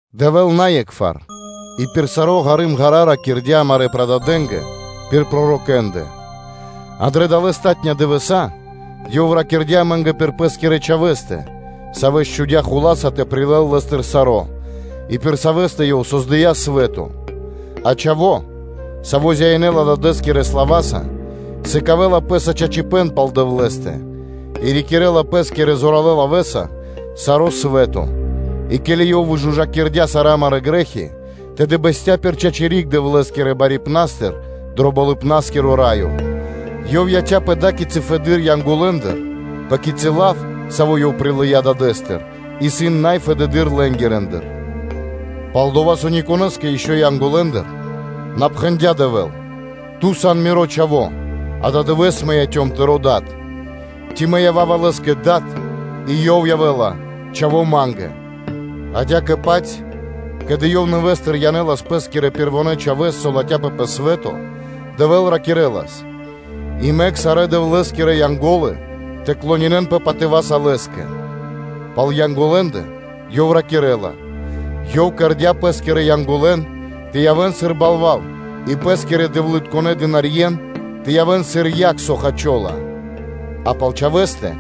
Дэвэ́л на е́кхвар и пир саро́ ґары́м-ґара́ (ва́го) ракирдя́ амарэ́ прададэнгэ пир пророкэ́ндэ, а дрэ далэ́ палатунэ́ (последня) дывэса́ Ёв ракирдя́ амэ́нгэ пир Пэ́скирэ Чхавэ́стэ, Савэс чхудя́ хула́са тэ прилэл Лэ́стыр саро́, и пир Савэ́стэ Ёв создыя́ свэ́то (лот): а Чхаво́, Саво́ зяинэла Дадэ́скирэ слава́са, сыкавэ́ла Пэ́са чачипэ́н пал Дэвлэ́стэ, и рикирэ́ла Пэ́скирэ зоралэ́ лавэ́са саро́ свэ́то, и ке́ли Ёв выжужакирдя́ сарэ́ амарэ́ грэ́хи, тэды бэсця́ пир чачи́ риг Дэвлэ́скирэ Барипнастыр дро Болыбна́скиро Раё. Ёв яця́ пэ ада́кицы фэды́р Янголэндыр, пэ кицы́ лав, саво́ Ёв прилыя́ Дадэ́стыр, исын най фэдэды́р лэнгирэндыр. Пал-дова́ со никонэ́скэ ишчо (инкэ́) Янголэндыр на пхэндя́ Дэвэ́л: “Ту сан Миро Чхаво́, ададывэ́с мэ яцём Тырэ́ Дадэ́са (Тыро́ Дад).” Ци: “Мэ ява́ва Лэ́скэ Дад, и Ёв явэ́ла Чхаво́ Ма́нгэ”? адя́кэ-паць, ке́ли Ёв нэвэ́стыр (нэвэ́с) янэлас Пэ́скирэ Пэрвонэ́ Чхавэ́с, со латхяпэ пэ свэ́то, Дэвэ́л ракирэ́лас: “И мэк сарэ́ Дэвлэ́скирэ Янго́лы тэ клонинэнпэ (тэ кэрэн шэрэ́са) патыва́са Лэ́скэ.” Пал Янголэндэ Ёв ракирэ́ла: “Ёв кэрдя́ Пэ́скирэ Янголэн тэ явэ́н сыр балва́л и Пэ́скирэ дэвлытконэ́ дынарье́н (слугэн) тэ явэ́н сыр яг, со хачола”, а пал Чхавэ́стэ: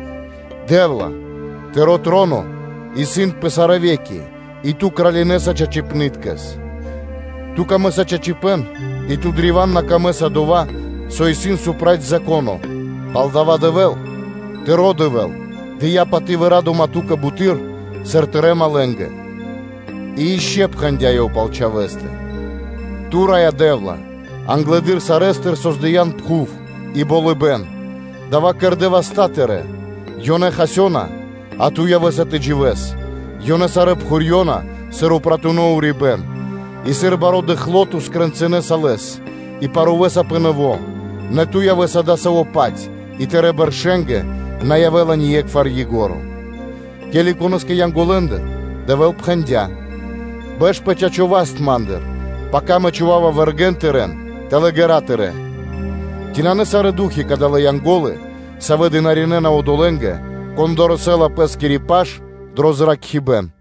“Дэ́вла, Тыро́ троно, исын пэ сарэ́ ве́ки и Ту кралинэса чачипны́ткэс. Ту́кэ пир ило́ чачипэ́н и Ту́кэ исын на пир ило́ дова́, со исын проти Зако́но, пал-дова́ со Дэвэ́л, Тыро́ Дэвэ́л дыя́ паты́в и ра́дыма Ту́кэ буты́р, сыр Тырэ́ малэ́нгэ (другэ́нгэ).” И ишчо (инкэ́) пхэндя́ Ёв пал Чхавэ́стэ: “Ту, Раё Дэ́вла, англэды́р сарэ́стыр создыян пхув, и болыбэ́н, дава́ кэрдэ́ васта́ Тырэ́. Ёнэ хасёна, а Ту явэ́са тэ дживэ́с, ёнэ сарэ́ пхурьёна, сыр упратуно урибэ́н; и сыр баро́ дыкхло Ту скрэнцынэса лэс и парувэса пэ нэво́, нэ Ту явэ́са адасаво́-паць и Тырэ́ бэршэнгэ на явэ́ла ние́кхвар ко́нцо (яго́ро).” Ке́ли конэ́скэ Янголэндыр Дэвэ́л пхэндя́: “Бэш пэ чачо́ васт Ма́ндыр, пака Мэ чхува́ва вэргэ́н тырэ́н тэл ґэра́ тырэ́.” Ци ёнэ исын на сарэ́ ду́хи, кадалэ́ Янго́лы, савэ́ дынаринэна (служынэна) одолэ́нгэ, кон дорэсэ́ла пэ́скири паш дро зракхибэ́н.